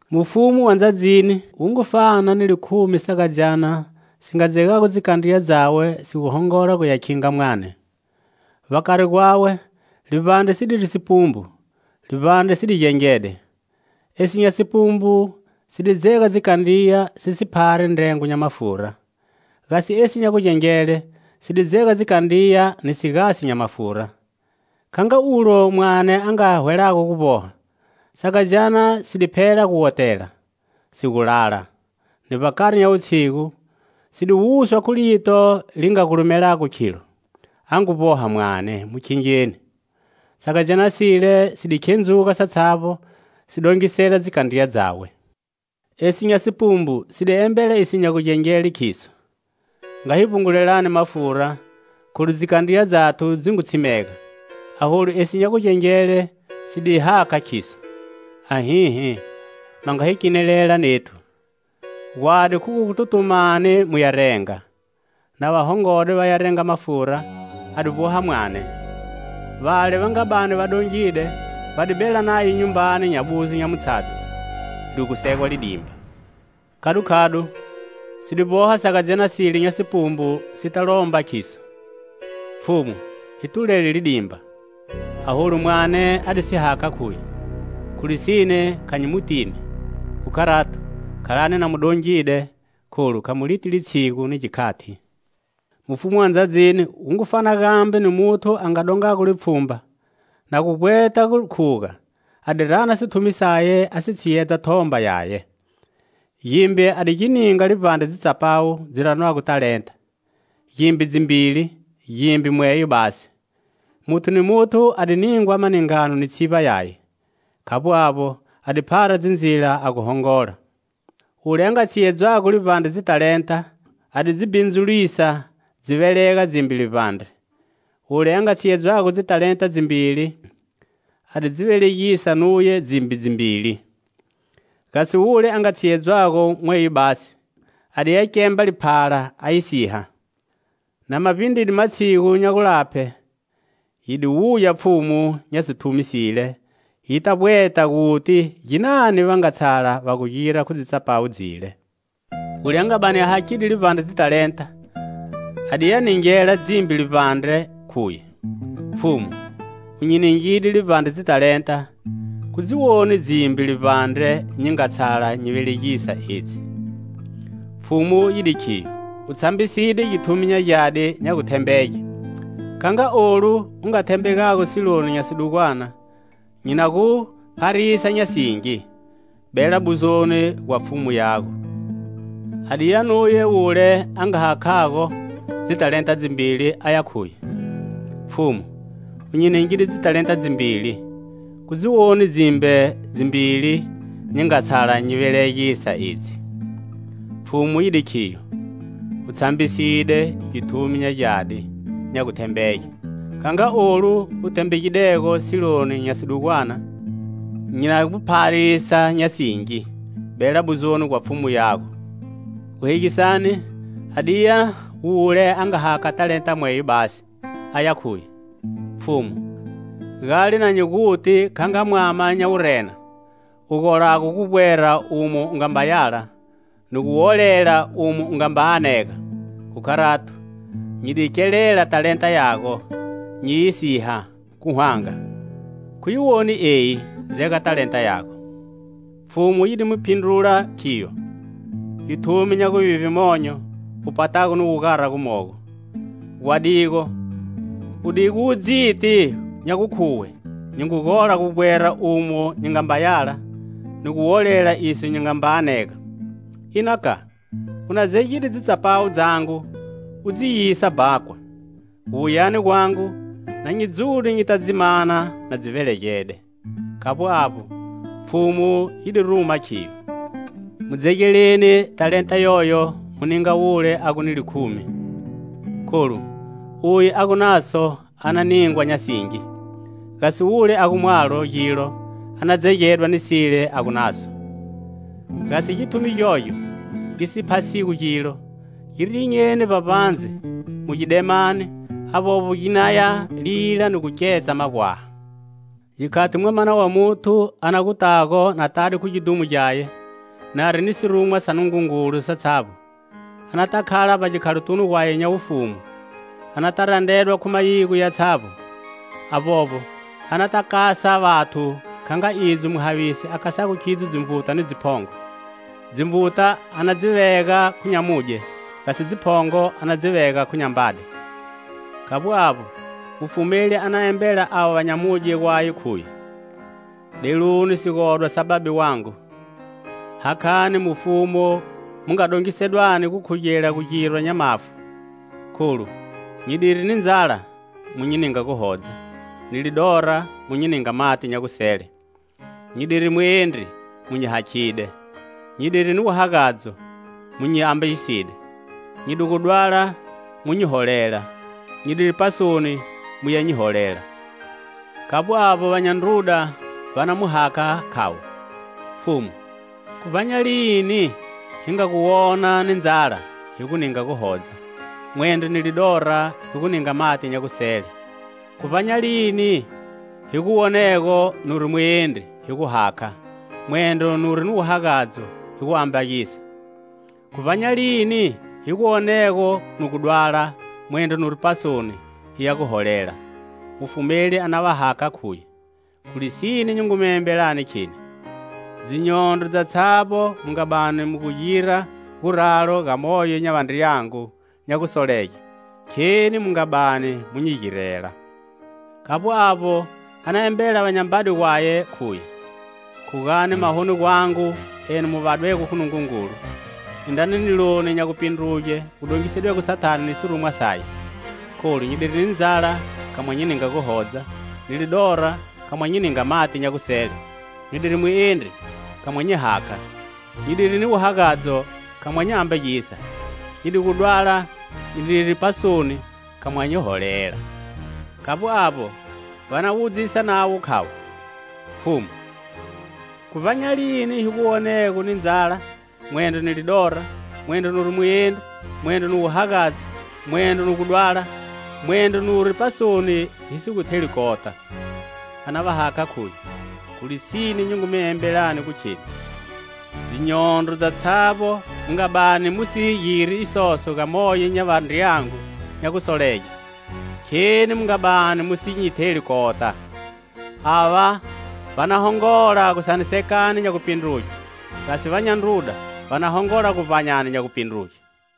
"Mufumu wa ndzadzini wu ngu fana ni likhumi sagadzyana si nga dzegago dzikandriya dzawe si gu hongola guya khinga mwame. Vbakari gwawe livbandre si diri sipumbu, livbandre si di gengede. Esi nya sipumbu si di dzega dzikandriya, si si phari ndrengo nya mafura; gasi esi nya gugengele si di dzega dzikandriya ni sigasi nya mafura. Kha nga ulo mwane a nga hwelago gu vboha, sagadzyana si di phela gu wotela, si gu lala. Ni vbakari nya wutshigu si di wuswa khu lito li nga gulumelago, khilo: 'A ngu vboha mwane, mu khingeni!' Sagadzyana sile si di khendzuga satshavbo, si dongisela dzikandriya dzawe. Esi nya sipumbu si di embela iso nya gugengele, khiso: 'Nga hi vbungulelani mafura, kholu dzikandriya dzathu dzi ngu tshimega.' Aholu esi nya gugengele si di hakha, khiso: 'Ahihi, ma nga hi kenelela nethu. Gwadi khu gu tutumani muya renga.' Na va hongode va ya renga mafura, a di vboha mwane. Vale va nga bani va dongide va di bela naye nyumbani nya buzo nya mutshadho, li gu segwa lidimba. Khadukhadu si di vboha sagadzyana sile nya sipumbu si ta lomba khiso: 'Pfhumu hi tulele lidimba.' Aholu mwane a di si hakha, khuye: 'Khu lisine, kha nyi mu tini.' Khu kharato, khalani na mu dongide, kholu kha mu li ti litshigu ni gikhati. "Mufumu wa ndzadzini wu ngu fana gambe ni muthu a nga dongago lipfhumba. Na gu vbweta gu khuga, a di rana sithumi saye a si tshiyedza thomba yaye. Gimbe a di gi ninga livbandre dzitsapawu dzi ranwago talenta; gimbe, dzimbili; gimbe, mweyo basi; muthu ni muthu a di ningwa maningano ni tshivba yaye. Khavbo avbo, a di phara dzindzila a gu hongola. Wule a nga tshiyedzwago livbandre dzitalenta a di dzi bhindzulisa dzi velega dzimbe livbandre. Wule a nga tshiyedzwago dzitalenta dzimbili a di dzi velegisa nuye dzimbe dzimbili. Gasi wule a nga tshiyedwago mweyo basi, a di ya kemba liphala a yi siha. "Na ma vbindride matshigu nya gulaphe, yi di wuya pfhumu nya sithumi sile yita vbweta guti ginani va nga tshala va gu gira khu dzitsapawu dzile. Wule a nga bani a hakhide livbandre dzitalenta a di ya ningela dzimbe livbandre, khuye: 'Pfhumu, u nyi ningide livbandre dzitalenta, khu dzi woni dzimbe livbandre nyi nga tshala nyi velegisa, edzi.' Pfhumu yi di khiyo: 'U tshambiside, githumi nya gyadi, nya guthembege; kha nga olu u nga thembegago siloni nya sidugwana, nyi na gu pharisa nya singi. Bela buzoni gwa pfhumu yago.' A di ya nuye wule a nga hakhago dzitalenta dzimbili aya khuye: 'Pfhumu, u nyi ningide dzitalenta dzimbili, khu dzi woni dzimbe dzimbili nyi nga tshala nyi velegisa, edzi.' Pfhumu yi di khiyo: 'U tshambiside, githumi nya gyadi, nya guthembege; kha nga olu u thembegidego siloni nya sidugwana, nyi na gu pharisa nya singi. Bela buzoni gwa pfhumu yago.' Guhegisani, a di ya wule a nga talenta mweyo basi, aya khuye: 'Pfhumu, gale na nyi guti kha nga mwama nya wurena, u golago gu vbwera umo u ngamba yala, ni gu wolela umo u ngamba anega. Khu kharato, nyi di kelela talenta yago, nyi yi siha, khu hwanga. Khu yi woni eyi, dzega talenta yago.' Pfhumu yi di mu phindrula, khiyo: 'Githumi nya guvivbe monyo, u patago ni wugara gumogo! Gwadigo u digu dziti nya gukhuwe nyi ngu gola gu vbwera umo nyi nga mba yala, ni gu wolela iso nyi ngamba anega. Ina ka, u na dzegide dzitsapawu dzangu u dzi yisa bhakwa; gu wuyani gwangu na nyi dzude nyita dzi mana na dzi velegede.' Khavbo avbo, Pfhumu yi di ruma khiyo: 'Mu dzegeleni talenta yoyo mu ninga wule a gu ni likhumi. Kholu uye a gu naso a na ningwa nya singi; gasi wule a gu mwalo gilo a na dzegedwa ni sile a gu naso. Gasi githumi gyogyo gi si phasigo gilo, gi rinyeni vbavbandze, mu gidemani; avbovbo ginaya lila ni gu ketsa magwaha.' "Gikhati Mwamana wa Muthu a na gu tago na tade khu gidhumo gyaye, nari ni sirumwa sa Nungungulu satshavbo, anata khala vbagikhalotunu gwaye nya wufumu. Anata randredwa khu mayigo yatshavbo; avbovbo, anata kasa vathu, kha nga idzo muhavisi a kasago khidzo dzinvuta ni dziphongo. Dzinvuta a na dzi vega khu nyamudye; gasi dziphongo a na dzi vega khu nyambade. Khavbo avbo, mufumeli a na embela avo va nyamudye gwaye, khuye: 'Deluni, sigodwa sa Babe wangu, hakhani mufumu mu nga dongisedwani gukhugela gugirwa nya mafu. Kholu nyi diri ni ndzala, mu nyi ninga guhodza; ni lidora, mu nyi ninga mati nya gusele; nyi diri muendri, mu nyi hakhide; nyi diri ni wuhagadzo, mu nyi ambagiside; nyi di gu dwala, mu nyi holela; nyi diri pasoni, muya nyi holela.' "Khavbo avbo, va nya ndruda va na mu hakha, khavo: 'Pfhumu, khu vbanyalini hi nga gu wona ni ndzala, hi gu ninga guhodza, mwendro ni lidora hi gu ninga mati nya gusele? Khu vbanyalini hi gu wonego nuri muendri, hi gu hakha, mwendro nuri ni wuhagadzo, hi gu ambagisa? Khu vbanyalini hi gu wonego nu gu dwala, mwendro nuri pasoni, hiya gu holela?' Mufumeli a na va hakha, khuye: 'Khu lisine nyi ngu mi embelani, kheni: dzinyondro dzatshavbo mu nga bani mu gira guralo ga moyo nya vandriyangu nya gusolege, kheni mu nga bani mu nyi girela.' "Khavbo avbo, a na embela va nyambade gwaye, khuye: 'Khugani mahoni gwangu, enu mu vadwego khu Nungungulu, indrani niloni nya gupindruge wu dongisedwego Sathane ni sirumwa saye. Kholu nyi diri ni ndzala, kha mwa nyi ninga guhodza; ni lidora, kha mwa nyi ninga mati nya gusele; nyi diri muendri, kha mwa nyi hakha; nyi diri ni wuhagadzo, kha mwa nyi ambagisa; nyi di gu dwala, nyi diri pasoni, kha mwa nyi holela.' Khavbo avbo, va na wudzisa navo, khavo: 'Pfhumu, khu vbanyalini hi gu wonego ni ndzala, mwendro ni lidora, mwendro nuri muendri, mwendro ni wuhagadzo, mwendro nu gu dwala, mwendro nuri pasoni, hi si gu theli kota?' A na va hakha, khuye: 'Khu lisine, nyi ngu mi embelani gu kheni: dzinyondro dzatshavbo mu nga bani mu si giri isoso ga moyo nya vandriyangu nya gusolege, kheni mu nga bani mu si nyi theli kota.' Ava vana hongola gusanisekani nya gupindruge; gasi vanya ndruda vana hongola guvbanyani nya gupindruge."